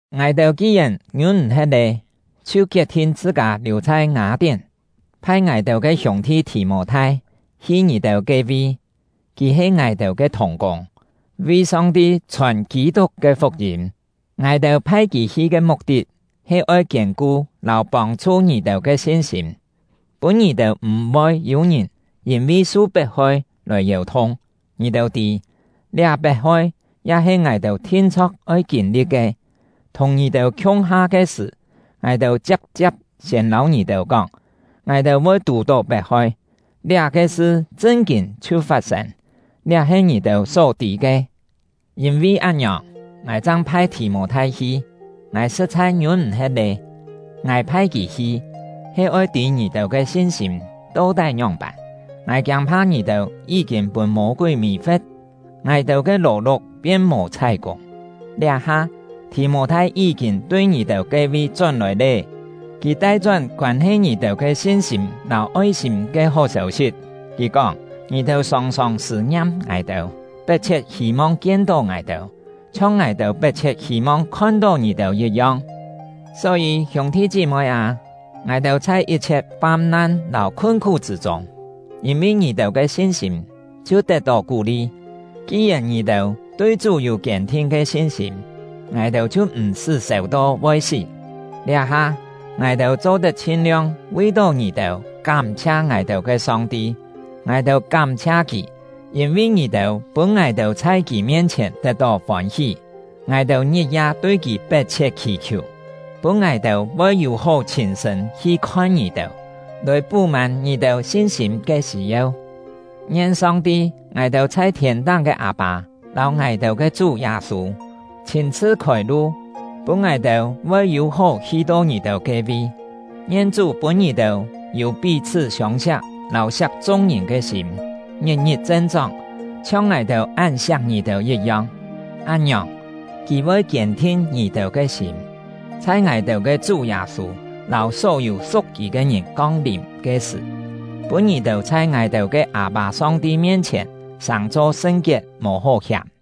Ngài-têu ki-yèn ngiûn-m̀-he̍t lé, chhiu kiet-thin chhṳ-kâ liù chhai Ngâ-tién, phai ngài-têu ke hiûng-thi Thì-mô-thai hi ngì-têu ke-vi; kì he ngài-têu ke thùng-kûng, vi Song-ti chhòn Kî-tuk ke fuk-yîm. Ngài-têu phai kì hi ke muk-tit he oi kiên-ku lâu pông-chhu ngì-têu ke sin-sîm, pûn ngì-têu m̀-voi yû-ngìn yîn-vi su pet-hoi lòi yèu-thung. Ngì-têu tî, liá pet-hoi ya he ngài-têu thin-chho̍k oi kîn-li̍t ke. Thùng ngì-têu khiung-ha ke sṳ̀, ngài-têu chia̍p-chia̍p siên lâu ngì-têu kóng, ngài-têu voi tù-tó pet-hoi. Liá-ke sṳ chṳn-kîn chhiu fat-sên; liá he ngì-têu só tî ke. Yîn-vi án-ngiòng, ngài chang phai Thì-mô-thai hi; ngài sṳ̍t-chhai ngiûn-m̀-he̍t lé. Ngài phai kì hi, he oi tî ngì-têu ke sin-sîm to-tái ngióng-pân. Ngài kiâng-pha ngì-têu yí-kîn pûn Mô-kúi mì-fe̍t, ngài-têu ke lò-luk pien mò chhái-kûng! Liá-ha, Thì-mô-thai yí-kîn tui ngì-têu ke-vi chón-lòi lé. Kì tai-chón koân-he ngì-têu ke sin-sîm lâu oi-sîm ke hó sêu-sit. Kì kóng, ngì-têu sòng-sòng sṳ̂-ngiam ngài-têu, pet-chhiet hî-mong kien-tó ngài-têu, chhiong ngài-têu pet-chhiet hî-mong khon-tó ngì-têu yit-yong. Só-yî, hiûng-thi chí-moi â, ngài-têu chhai yit-chhiet fam-nan lâu khun-khú chṳ̂ chûng, yîn-vi ngì-têu ke sin-sîm chhiu tet-tó kú-li. Ki-yèn ngì-têu tui Chú yû kiên-thin ke sin-sîm, ngài-têu chhiu m̀-sṳ́ sèu-to voi sí. Liá-ha, ngài-têu cho-tet chhin-liong vi-tó ngì-têu kám-chhia ngài-têu ke Song-ti. Ngài-têu kám-chhia Kì, yîn-vi ngì-têu pûn ngài-têu chhai Kì mien-chhièn tet-tó fôn-hí. Ngài-têu ngit-ya tui Kì pet-chhiet khì-khiù, pûn ngài-têu voi yû-hó chhîn-sṳ̂n hi khon ngì-têu, lòi pú-mân ngì-têu sin-sîm ke sî-yeu. Ngien Song-ti — ngài-têu chhai thiên-táng ke Â-pâ lâu ngài-têu ke Chú Yâ-sû chhîn-chhṳ khôi-lu, pûn ngài-têu voi yû-hó hi-to ngì-têu ke-vi. Ngien Chú pûn ngì-têu yû pí-chhṳ́ siông-siak lâu siak chung-ngìn ke sîm, ngit-ngit chen-chóng, chhiong ngài-têu án siak ngì-têu yit-yong. Án-ngiòng, Kì voi kiên-thin ngì-têu ke sîm, chhai ngài-têu ke Chú Yâ-sû lâu só-yû su̍k kì ke ngìn kong-lìm ke sṳ̀, pûn ngì-têu chhai ngài-têu ke Â-pâ Song-ti mien-chhièn sàng-cho sṳn-kiet, mò hó hiàm.